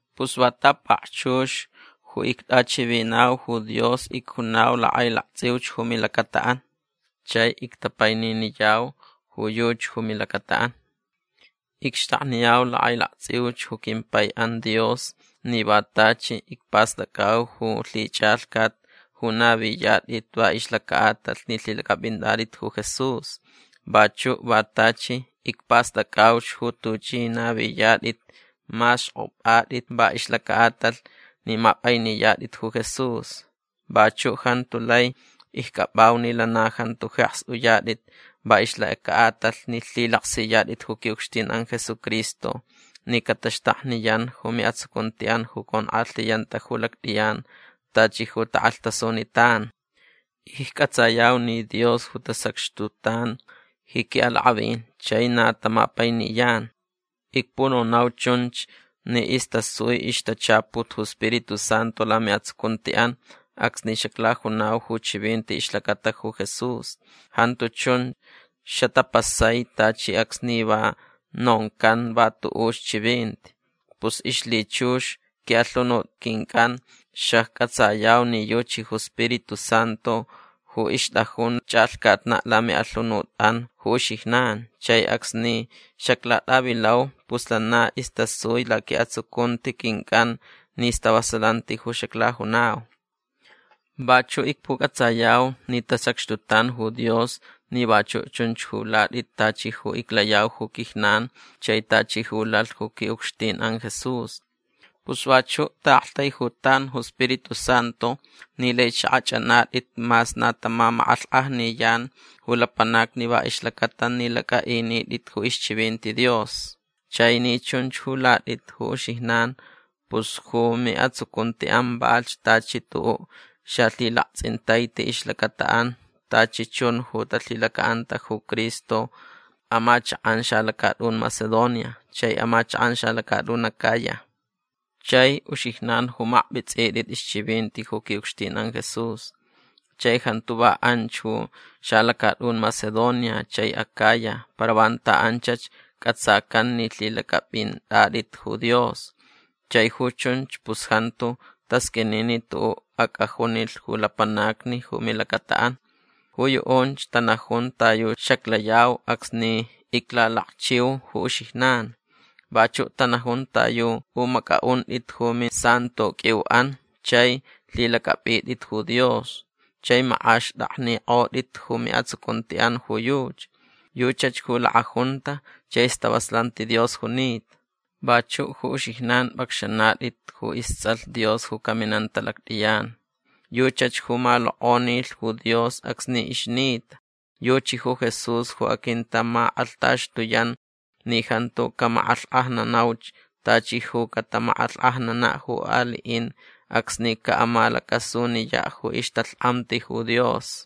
Pus va ta pakchux ju ictʼachivinau ju Dios icjunau lakʼailaktsʼiuch ju milacataʼan. Chai ictapaininiyau ju yuchi ju milacataʼan. Icxtakniyau lakʼailaktsʼiuch ju quimpaiʼan Dios ni va tachi icpastʼacʼau ju lhichʼalhcat ju naviyatʼit va ixlacaʼatalh ni lhilacʼapʼintʼatʼit ju Jesús. Vachuʼ va tachi icpastʼacʼauch ju tuchʼi naviyatʼit mas xkʼopʼatʼit va ixlacaʼatalh ni mapʼainiyatʼit ju Jesús. Vachuʼ jantu lai iccʼapʼau ni lana jantu jeks uyatʼit va ixlacaʼatalh ni lhilaksiyatʼit ju quiʼucxtinʼan Jesucristo ni cataxtakniyan ju miʼatsucuntiʼan ju conkʼalhiyanta ju lactʼiyan tachi ju takʼalhtasunitan. Iccʼatsayau ni Dios ju tasacxtutan ji quiʼalakʼavin chai na tamapainiyan. Icpunonau chunch ni istasui ixtachaput ju Spiritu Santu lamiʼatsucuntiʼan acsni xaclajunau ju chivinti ixlacata ju Jesús. Jantu chun xatapasai tachi acsni va noncan va tuʼuch chivinti. Pus ixlhichux quiʼalhunut quincʼan xaccʼatsayau ni yuchi ju Spiritu Santu ju ixtʼajun chʼalhcatnaʼ lamiʼalhunutʼan ju uxijnan. Chai acsni xaclatʼavilau pus lana istasui laquiʼatsucunti quincʼan ni stavasalanti ju xaclajunau. Vachuʼ icpucʼatsayau ni tasacxtutan ju Dios ni vachuʼ chunch ju latʼit tachi ju iclayau ju quijnan chai tachi ju lalh ju quiʼucxtinʼan Jesús. Pus vachuʼ taʼaktaijutan ju Spiritu Santu ni laich xakʼachʼanatʼit mas na tamamakʼalhkʼajniyan ju lapanacni va ixlacata ni lacʼaʼinitʼit ju ixchivinti Dios. Chai ni chunch ju latʼit ju uxijnan pus ju miʼatsucuntiʼan valhch tachi tuʼuʼ xalhilaktsʼintaiti ixlacataʼan tachi chun ju talhilacaʼanta ju Cristo amachakʼan xalacatʼun Macedonia chai amachakʼan xalacatʼun Acaya. Chai uxijnan ju makpʼitsʼitʼit ixchivinti ju quiʼucxtinʼan Jesús. Chai jantu va anch ju xalacatʼun Macedonia chai Acaya para vanta anchach cʼatsacan ni lhilacʼapʼintʼatʼit ju Dios. Chai ju chunch pus jantu tasqʼuini ni tuʼuʼ acʼajunilh ju lapanacni ju milacataʼan. Ju yuʼunch tanajun ta yu xaclayau acsni iclalakchiu ju uxijnan. Vachuʼ tanajun ta yu pʼumacʼaʼuntʼit ju misantoqʼuiuʼan chai lhilacʼapʼitʼit ju Dios chai makʼaxtʼaknikʼotʼit ju miʼatsucuntiʼan ju yuchi. Yuchach ju lakʼajunta chai stavasalanti Dios junita. Vachuʼ ju uxijnan pʼacxanatʼit ju istsʼalh Dios ju caminanta lactʼiyan. Yuchach ju malokʼonilh ju Dios acsni ixnita. Yuchi ju Jesús ju aquintamakʼalhtaxtuyan ni jantu camakʼalhkʼajnanauch tachi ju catamakʼalhkʼajnanaʼ ju aliʼin acsni caʼamalacasuniyaʼ ju ixtalhkʼamti ju Dios.